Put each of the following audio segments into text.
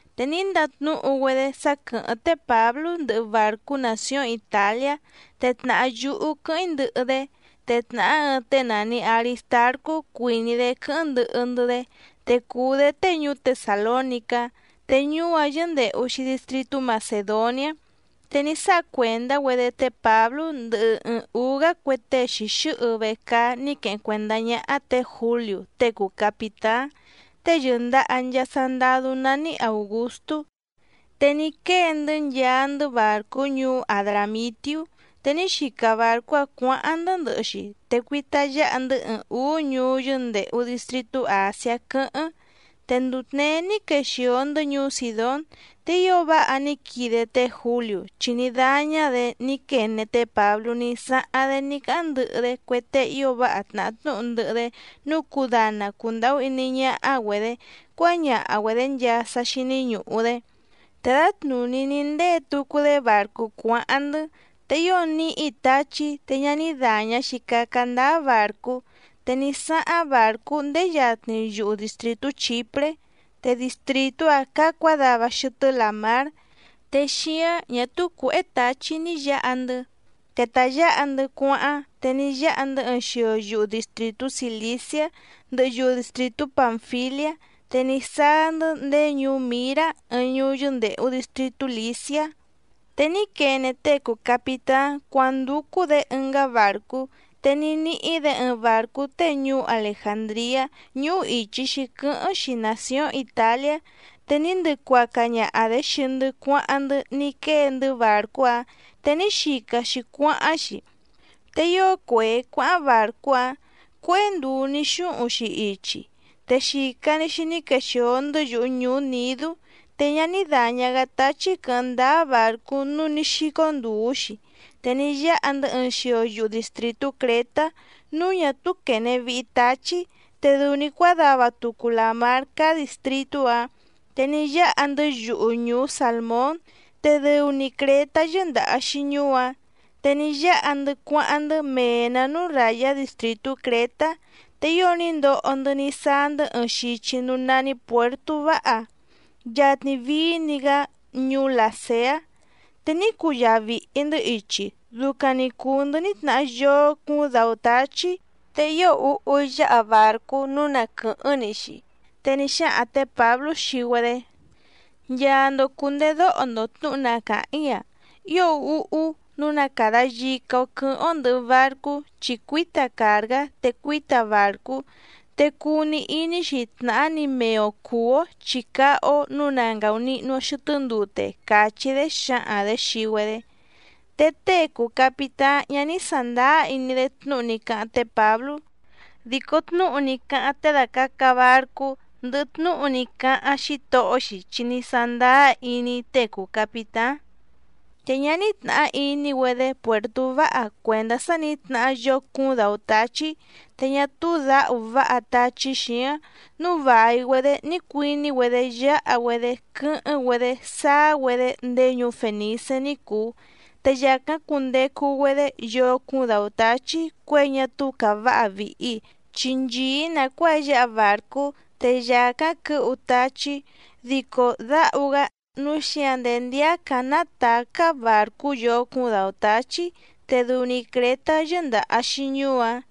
Te ní ndatnúhu‑güedé sá quɨ̀hɨ́ⁿ té Pǎblú ndɨhɨ bàrcú nàcióⁿ Itàliá, te tnàhá yúhú quɨ́hɨ́ⁿ‑í ndɨhɨ‑dé. Te tnàhá ɨɨⁿ tée nàni Aristarcú cuìní‑dé quɨ́hɨ́ⁿ ndɨhɨ‑ndɨ́‑dé, te cùu‑dé tée ñuú Tesàlónicá, te ñuú‑áⁿ yɨ́ndèhu‑xi distritú Macèdoniá. Te ní sáha cuèndá‑güedé té Pǎblú ndɨhɨ ɨɨⁿ ǔú‑gá cue tée xìxɨ́hɨ vecaá ní queheⁿ cuèndá ñáhá tě Jǔliú tée cùu capitáⁿ, tée yɨ̀ndaha nchaa sandadú nání Àugustú, te ní quée‑ndɨ́ nchaa‑ndɨ́ bàrcú ñuú Adràmitiú. Te ní xica bàrcú‑áⁿ cuǎháⁿ‑ndɨ́ ndɨhɨ‑xi te cuita yáha‑ndɨ́ ɨɨⁿ ǔú ñuú yɨ́ndèhu distritú Àsiá quɨ́hɨ́ⁿ. Te nduu tněé ní quexìo‑ndɨ́ ñuú Sìdón. Te ío váha ní quide té Jǔliú, chi ní dáñá‑dě ní quene té Pǎblú ní sáháⁿ‑dé ní cáháⁿ ndɨhɨ‑dé cue tée ío váha tnàhá tnúhu ndɨhɨ‑dé nǔu cudana cundàhú iní ñáhá‑güedě cuáñaha‑güedě nchaa sá xíní ñùhu‑dé. Te dǎtnùní ní ndée tucu‑dé bàrcú cuáháⁿ‑ndɨ́. Te ío níhi táchí te ñá ní dàña‑xi caca ndáá bàrcú, te ní sáháⁿ bàrcú ndéé yatni yuhu dìstritú Chìpré, te distrìtú‑áⁿ cáá cuǎdava xɨtɨ́ làmár, te xíáⁿ ñà túú cuěhé tǎchí ni yǎha‑ndɨ́. Te ta yǎha‑ndɨ́ cuáháⁿ, te ní yáha‑ndɨ́ ɨɨⁿ xio yuhu dìstritú Cìliciá ndɨhɨ yuhu dìstritú Pànfiliá, te ní sáá‑ndɨ́ ndéé ñuú Mǐrá ɨɨⁿ ñuú yɨ́ndèhu distritú Lìciá. Te ní quene tée cùu capitáⁿ cuándúcú‑dě ɨngá bàrcú, te ní níhí‑dě ɨɨⁿ bàrcú tée ñuú Alejàndriá, ñúhú ìchi‑xi quɨ́hɨ́ⁿ‑xi nàcióⁿ Itàliá. Te ní ndɨcuaca ñaha‑dě xii‑ndɨ́ cuáháⁿ‑ndɨ́ ní quée‑ndɨ́ bàrcú‑áⁿ, te ní xica‑xi cuáháⁿ‑xi. Te ío cuèé cuáháⁿ bàrcú‑áⁿ, cuéhé nduu ní xúhuⁿ‑xi ichi, te yica‑ni nǐ quexìo‑ndɨ́ yuhu ñùú Nìdú, te ñá ní dàña‑gá táchí quɨ̌hɨ́ⁿ ndáá bàrcú nǔu ní xícó ndùú‑xi. Te ní yáha‑ndɨ́ ɨɨⁿ xio yuhu dìstritú Crětá núú ñà túú quène vihi táchí, te dɨu‑ni cuádava tucu làmár cáá dìstritú‑áⁿ. Te ní yáha‑ndɨ́ yuhu ñùú Sàlmón, te dɨu‑ni Crětá yɨ́ndàha‑xi ñuú‑áⁿ. Te ní yáha‑ndɨ́ cuáháⁿ‑ndɨ́ mee‑nǎ núú ràyá distrìtú Crětá, te ío ní ndoho‑ndɨ́ ní sáá‑ndɨ́ ɨɨⁿ xichi núú nání Puèrtú Váha, yatni vií‑ni‑gá ñuú Làseá. Te ní cuyaa vìhi‑ndɨ́ ichi, ducaⁿ‑ni cùu‑ndɨ́ ní tnahá yóó cúúⁿ dǎú táchí, te ío úhú yǎha bàrcú nǔu na quɨ̀hɨ́ⁿ‑ni‑xi. Te ní xáhaⁿ tě Pǎblú xii‑güedé: —Nchaa‑ndo cùndedóho‑ndo tnǔhu na càháⁿ‑í‑a. Ío úhú núú na càda yica‑o quɨ́hɨ́ⁿ‑ó ndɨ̀hɨ barcú chi cuíta càrgá te cuíta bàrcú, te cuu‑ni iní‑xi tnàhá‑ni mee‑o cùú‑ó chi cáhá‑ó nǔu na ngàunihnu‑o xɨtɨ́ ndute —càchí‑dé xǎhaⁿ‑dě xii‑güedé. Te tée cùu capitáⁿ ñá ní sàndáá iní‑dé tnúhu ní cáháⁿ té Pǎblú. Dico tnúhu ní cáháⁿ tée dàcaca barcú ndɨhɨ xítohó‑xi chi ní sándáá iní‑dé. Te ñá ní tnàhá iní‑güedé Puèrtú Váha cuèndá sá nǐ tnahá yóó cúúⁿ dǎú táchí, te ñá túú dǎhu váha táchí xǐáⁿ, núu vài‑güedé ní cuiní‑güedé yáha‑güedé quɨ́hɨ́ⁿ‑güedé sáá‑güedé ndéé ñuú Fènicé ní cùu. Te yàcáⁿ cundecu‑güedé yóó cúúⁿ dǎú táchí cuěi ñá túú càváha vìhi, chi nchìí nàcuáa yǎha bàrcú, te yàcáⁿ quɨ̌hu táchí, dico dǎhu‑gá. Núu xíǎⁿ ndéé ndíácǎⁿ nátàcá bàrcú yóó cúúⁿ dǎú táchí, te dɨu‑ni Crětá yɨ́ndàha‑xi ñuú‑áⁿ.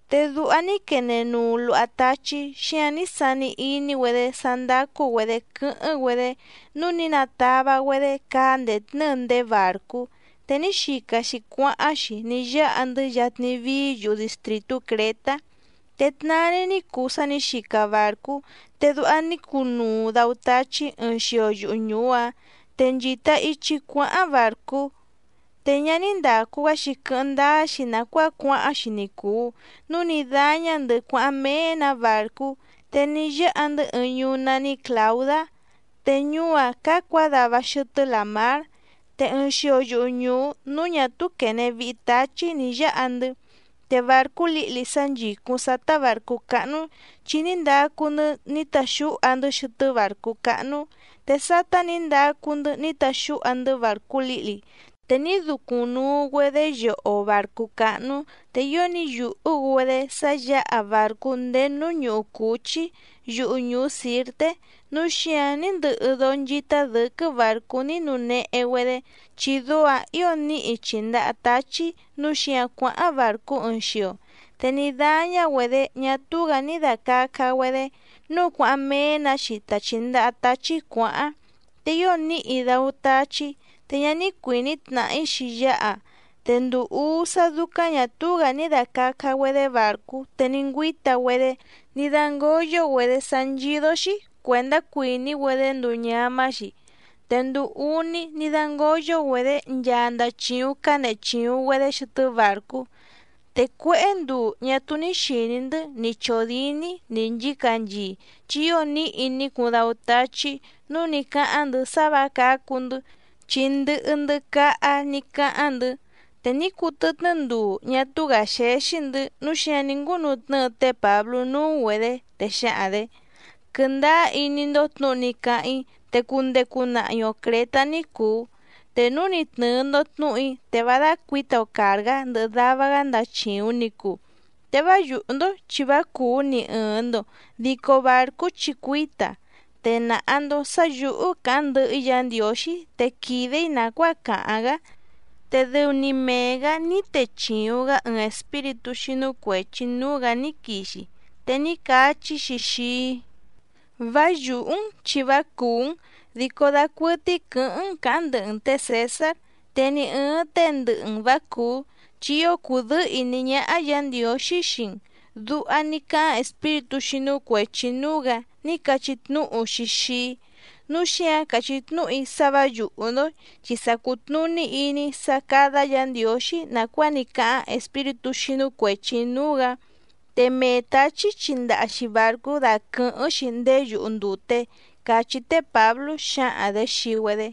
Te duha ní quene nuu luha táchí, xíǎⁿ ní sani iní‑güedé sá ndácú‑güedě quɨ́hɨ́ⁿ‑güedé, núu ní natava‑güedé caá ndètnɨ́ɨ ndéé bàrcú, te ní xica‑xi cuáháⁿ‑xi ní yáha‑ndɨ́ yatni vií yuhu dìstritú Crětá. Te tnaa‑ni ní cuu sá nǐ xica bàrcú, te duha ní cunuu dǎú táchí ɨɨⁿ xio yuhu ñùú‑áⁿ te nchìta ichi cuáháⁿ bàrcú. Te ñá ní ndàcu‑gá‑xi quɨ́hɨ́ⁿ ndáá‑xi nàcuáa cuáháⁿ‑xi ni cùu, núu ní dáñá‑ndɨ̌ cuáháⁿ méé‑nǎ bàrcú. Te ní yáha‑ndɨ́ ɨɨⁿ ñuú nání Clàudá, te ñuú‑áⁿ cáá cuǎdava xɨtɨ́ làmár. Te ɨɨⁿ xio yuhu ñùú núú ñà túú quène vihi táchí nǐ yáha‑ndɨ́, te bàrcú lǐhli sá nchìcúⁿ sátá bàrcú cáhnú, chi ní ndacu‑ndɨ́ ní taxúha‑ndɨ́ xɨtɨ́ bàrcú cáhnú. Te sátá nǐ ndacu‑ndɨ́ ní taxúha‑ndɨ́ bàrcú lǐhli, te ní ducuⁿ nuu‑güedé yoho bàrcú cáhnú. Te ío ní yùhú‑güedé sá yǎha bàrcú ndéé núú ñúhú cǔchí yuhu ñùú Sǐrté, núu xíǎⁿ ní ndɨhɨ dóó nchítá dɨ̌quɨ́ bàrcú ní nuu nehe‑güedé, chi dóó‑ǎⁿ ǐo níhi chìndaha táchí, núu xíǎⁿ cuáháⁿ bàrcú ɨɨⁿ xio. Te ní dáñá‑güedě ñá túú‑gǎ ní dàcaca‑güedé, núu cuáháⁿ méé‑nǎ‑xi ta chìndaha táchí cuǎháⁿ. Te ío níhi dáú táchí, te ñá ní cuìní tnàhí‑xi yáha. Te nduu úú sá dúcáⁿ ñà túú‑gǎ ní dàcaca‑güedé bàrcú te ní ngüíta‑güedé ní dángǒyo‑güedé sá nchídó‑xí cuèndá cuìní‑güedé nduu ñamá‑xi. Te nduu úní ní dǎngoyo‑güedé nchaa ndachìuⁿ cánehe chìuⁿ‑güedé xɨtɨ́ bàrcú. Te cuéhé nduu ñá túú ní xìní‑ndɨ́ ni chòdíní ni nchǐcanchii, chi ío níhi ní cuuⁿ dáú táchí, núu ní cáháⁿ‑ndɨ̌ sá vǎ cǎcu‑ndɨ́, chi ndɨhɨ‑ndɨ́ cáhá ní cáháⁿ‑ndɨ̌. Te ní cuu tɨtnɨ́ nduu ñá túú‑gǎ xéxí‑ndɨ̌, núu xíǎⁿ ní ngúnutnɨ́ɨ té Pǎblú núú‑güedě, te xǎhaⁿ‑dě: —Quɨndáá iní‑ndó tnǔhu ní cáháⁿ‑í, te cundecu nahi‑o Crětá ní cùu. Te núu ni tnɨ̀ɨ‑ndo tnúhu‑í, te vá dácuǐta‑o càrgá ndɨhɨ dava‑gá ndàchiuⁿ ni cuu. Te vá yùhú‑ndó chi vá cùú ni ɨ̀ɨⁿ‑ndo dico bàrcú chi cuíta. Te nàha‑ndo sá yǔhú càháⁿ ndɨhɨ‑í Yǎ Ndiǒxí te quìde‑í nàcuáa càháⁿ‑gá. Te dɨu‑ni mee‑gǎ ní techìuⁿ‑gá ɨɨⁿ espíritú xínú cuèchi núú‑gǎ ní quixi, te ní cachí‑xi xii‑í: “Vá yùhú‑n chi vá cùú‑n, dico dacuɨtɨ́í quɨ̌hɨ́ⁿ‑n cǎháⁿ ndɨhɨ‑n tě Cèsár. Te ni ɨ̀ɨⁿ tée ndɨhɨ‑n vǎ cùú, chi ío cùdɨ́ɨ́ ìní ñáhá Yǎ Ndiǒxí xii‑n”, duha ní cáháⁿ espíritú xínú cuèchi núú‑gǎ ní cachí tnúhu‑xi xii‑í. Núu xíǎⁿ càchí tnúhu‑í sá vǎ yùhú‑ndó, chi sa cùtnuní iní‑í sá cádá Yǎ Ndiǒxí nàcuáa ní cáháⁿ espíritú xínú cuèchi núú‑gǎ. Te mee tǎchí chindaha‑xi bàrcú daquɨ̀hɨ́ⁿ‑xi ndéé yuhu ndùte —cachí té Pǎblú xǎhaⁿ‑dě xii‑güedé.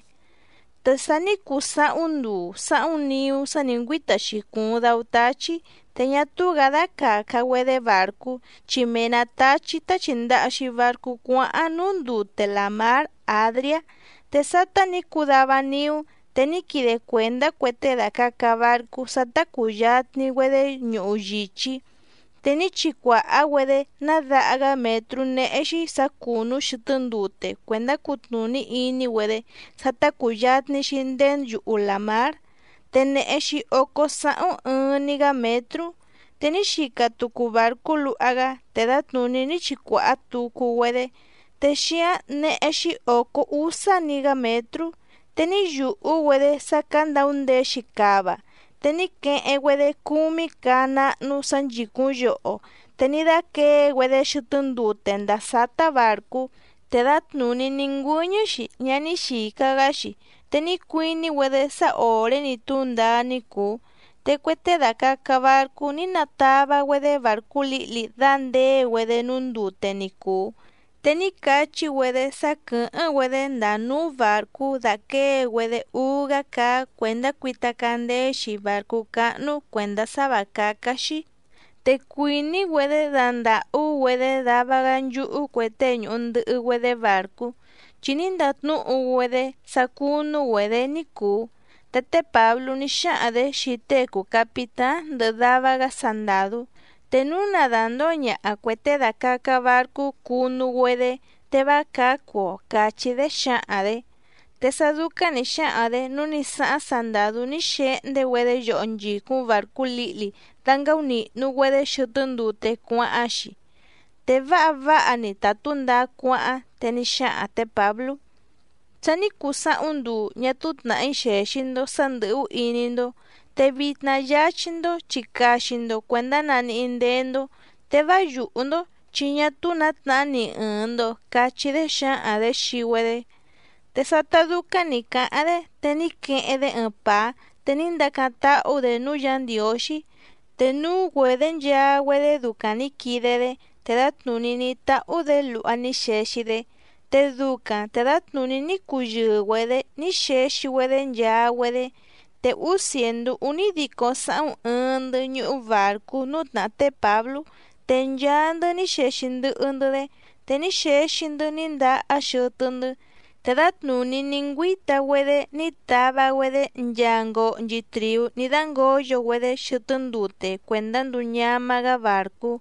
Te sa ní cuu sáhúⁿ nduu sáhúⁿ niú sá nǐ ngüíta‑xi cùuⁿ dáú táchí, te ñá túú‑gǎ dácàca‑güedé bàrcú, chi mee‑nǎ táchí tá chìndaha‑xi barcú cuáháⁿ núú ndute làmár Àdriá. Te sátá nǐ cuu dava niú, te ní quide cuèndá cue tée dàcaca barcú sá tá cùyatni‑güedé ñuhu yìchí. Te ní chicuàhá‑güedé ná daha‑gá mětrú néhé‑xí sǎ cùnú xɨtɨ́ ndute cuèndá cutnùní iní‑güedé sá tá cùyatni‑xi ndéé yuhu làmár, te nèhe‑xi ócó sáhúⁿ ɨɨⁿ‑ni‑gá mětrú. Te ní xica tucu bàrcú luha‑gá, te dǎtnùní ní chicuàhá tucu‑güedé, te xíáⁿ néhé‑xí ǒcó úsá‑ni‑gá mětrú. Te ní yùhú‑güedé sá candaundeé‑xi cava, te ní queheⁿ‑güedé cúmí caá náhnú sǎ nchìcúⁿ yoho, te ní dáquěe‑güedé xɨtɨ́ ndute ndàa sátá bàrcú, te dǎtnùní ní ngüɨ́ñɨ́‑xi ñá ní xìca‑gá‑xi, te ní cuiní‑güedé sá òré‑ni túndaá ní cùu. Te cue tée dàcaca barcú ní natava‑güedé bàrcú lǐhli dàndée‑güedé núú ndute ni cùu, te ní cachí‑güedé sá quɨ̀hɨ́ⁿ‑güedé ndàa núú bàrcú dàquée‑güedé úú‑gá caá cuèndá cuita candeé‑xi bàrcú cáhnú cuèndá sá vǎ cácá‑xí. Te cuìní‑güedé dandàhú‑güedé dava‑gá nchúhú cue tée ñùhu ndɨhɨ‑güedé bàrcú, chi ní ndatnúhu‑güedé sá cúnú‑güedě ní cùu. Te té Pǎblú ní xáhaⁿ‑dě xii tée cùu capitáⁿ ndɨhɨ dava‑gá sandàdú: —Te núu na dàndóo ñaha cuè tée dàcaca barcú cunu‑güedé, te vá cǎcu‑o —càchí‑dé xǎhaⁿ‑dě. Te sá dúcáⁿ nǐ xáhaⁿ‑dě nǔu ní sáháⁿ sandàdú ní xehndé‑güedé yoho nchìcúⁿ bàrcú lǐhli dángáúnìhnu‑güedé xɨtɨ́ ndute cuáháⁿ‑xi. Te váha váha‑ni ta tǔndaá cuáháⁿ, te ní xáhaⁿ tě Pǎblú: —Sa ní cuu sáhúⁿ nduu ñá túú tnàhí xèxi‑ndo sá ndɨ̀hú iní‑ndó. Te vitna yáchí‑ndó, chi caxi‑ndo cuèndá naníhí ndéé‑ndó, te vá yùhú‑ndó chi ñá túú nǎ tnahá ni ɨ̀ɨⁿ‑ndo —cachí‑dé xǎhaⁿ‑dě xii‑güedé. Te sátá dúcáⁿ nǐ cáháⁿ‑dé, te ní queheⁿ‑dé ɨɨⁿ pàá, te ní ndacáⁿ táhú‑dě núú Yǎ Ndiǒxí, te núú‑güedě nchaa‑güedé ducaⁿ nǐ quide‑dé, te dǎtnùní ní táhú‑dě luha ní xexi‑dé. Te ducaⁿ te dǎtnùní ní cuyɨɨ‑güedě ní xexi‑güedé nchaa‑güedé. Te úú cièndú únídico sáhúⁿ ɨɨⁿ‑ndɨ́ ñúhú bàrcú núú tnàhá té Pǎblú, te nchaa‑ndɨ́ ní xexi ndɨhɨ‑ndɨ́‑dé. Te ní xexi‑ndɨ́ ní ndahá xɨtɨ́‑ndɨ́. Te dǎtnùní ní ngüíta‑güedé ní tava‑güedé nchaa ngohnchi trìú ní dǎngoyo‑güedé xɨtɨ́ ndute cuèndá nduu ñamá‑gá bàrcú.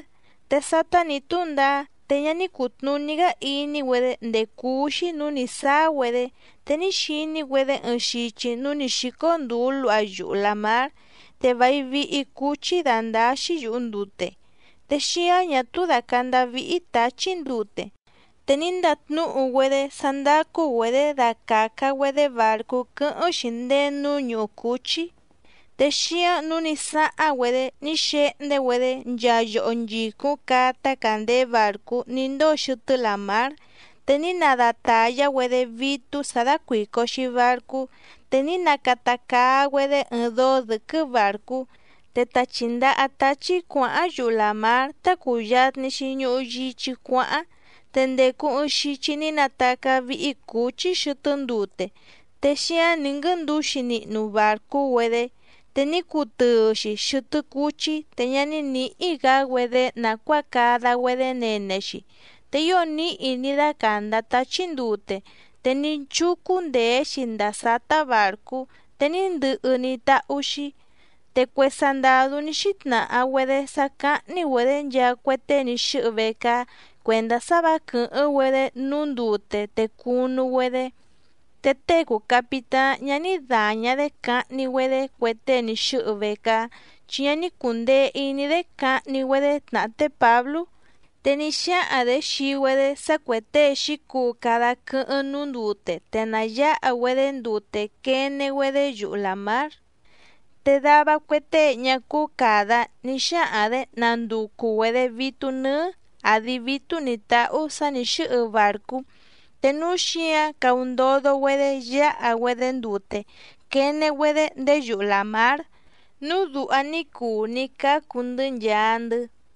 Te sátá nǐ túndaá, te ñá ní cùtnuní‑gá iní‑güedé ndèé cúú‑xí nǔú nǐ sáá‑güedé, te ní xiní‑güedé ɨɨⁿ xichi núú nǐ xícó ndùú luha yuhu làmár, te vài vihi cúchí dándáá‑xí yùhu ndute, te xíáⁿ ñà túú dàcandá víhí tǎchí ndute. Te ní ndatnúhu‑güedé sá ndácú‑güedě dacàca‑güedé bàrcú quɨ́hɨ́ⁿ‑xi ndéé núú ñúhú cǔchí. Te xíǎⁿ nǔu ní sáháⁿ‑güedé ní xehndé‑güedé nchaa yoho nchìcúⁿ caá tácàndeé bàrcú ní ndóo xɨtɨ́ làmár, te ní nadatàyá‑güedé vítú sǎ dácuìco‑xi barcú, te ní nacata caa‑güedé ɨɨⁿ dóó dɨ̌quɨ́ bàrcú, te ta chìndaha táchí cuǎháⁿ yuhu làmár tá cùyatni‑xi ñuhu yichí cuáháⁿ. Te ndècu ɨɨⁿ xichi ní natacá víhí cǔchí xɨtɨ́ ndute, te xíáⁿ nǐ nguɨ́ndǔxi nihnu bàrcú‑güedé, te ní cutɨɨ‑xi xɨtɨ́ cúchí, te ñá ní nǐhí‑gǎ‑güedé nàcuáa cada‑güedé nene‑xi. Te ío níhi ní dácàndá táchí ndute, te ní chúcú ndèé‑xi ndàa sátá bàrcú, te ní ndɨhɨ ní táhú‑xí. Te cue sandàdú ní xítnàha‑güedé sá cáhní‑güedě nchaa cue tée ní xɨ́hɨ vecaá cuèndá sá vǎ quɨ̀hɨ́ⁿ‑güedé núú ndute te cunu‑güedé. Te tée cùu capitáⁿ ñá ní dàña‑dé cahni‑güedé cue tée ní xɨ́hɨ vecaá, chi ñá ní cùndee iní‑dé cahni‑güedé tnàhá té Pǎblú. Te ní xáhaⁿ‑dě xii‑güedé sá cuè tée xǐcuu cada quɨ́hɨ́ⁿ núú ndute te na yǎha‑güedé ndute quene‑güedé yuhu làmár. Te dava cue tée ñá cúú càda, ní xáhaⁿ‑dě nanducu‑güedě vítú nɨ́ɨ́ àdi vítú nǐ táhú sǎ nǐ xɨ́hɨ bàrcú, te núú xǐǎⁿ caundodo‑güedé yáha‑güedé ndute quene‑güedé ndéé yuhu làmár. Núu duha ní cuu ní cácu‑ndɨ́ nchaa‑ndɨ́.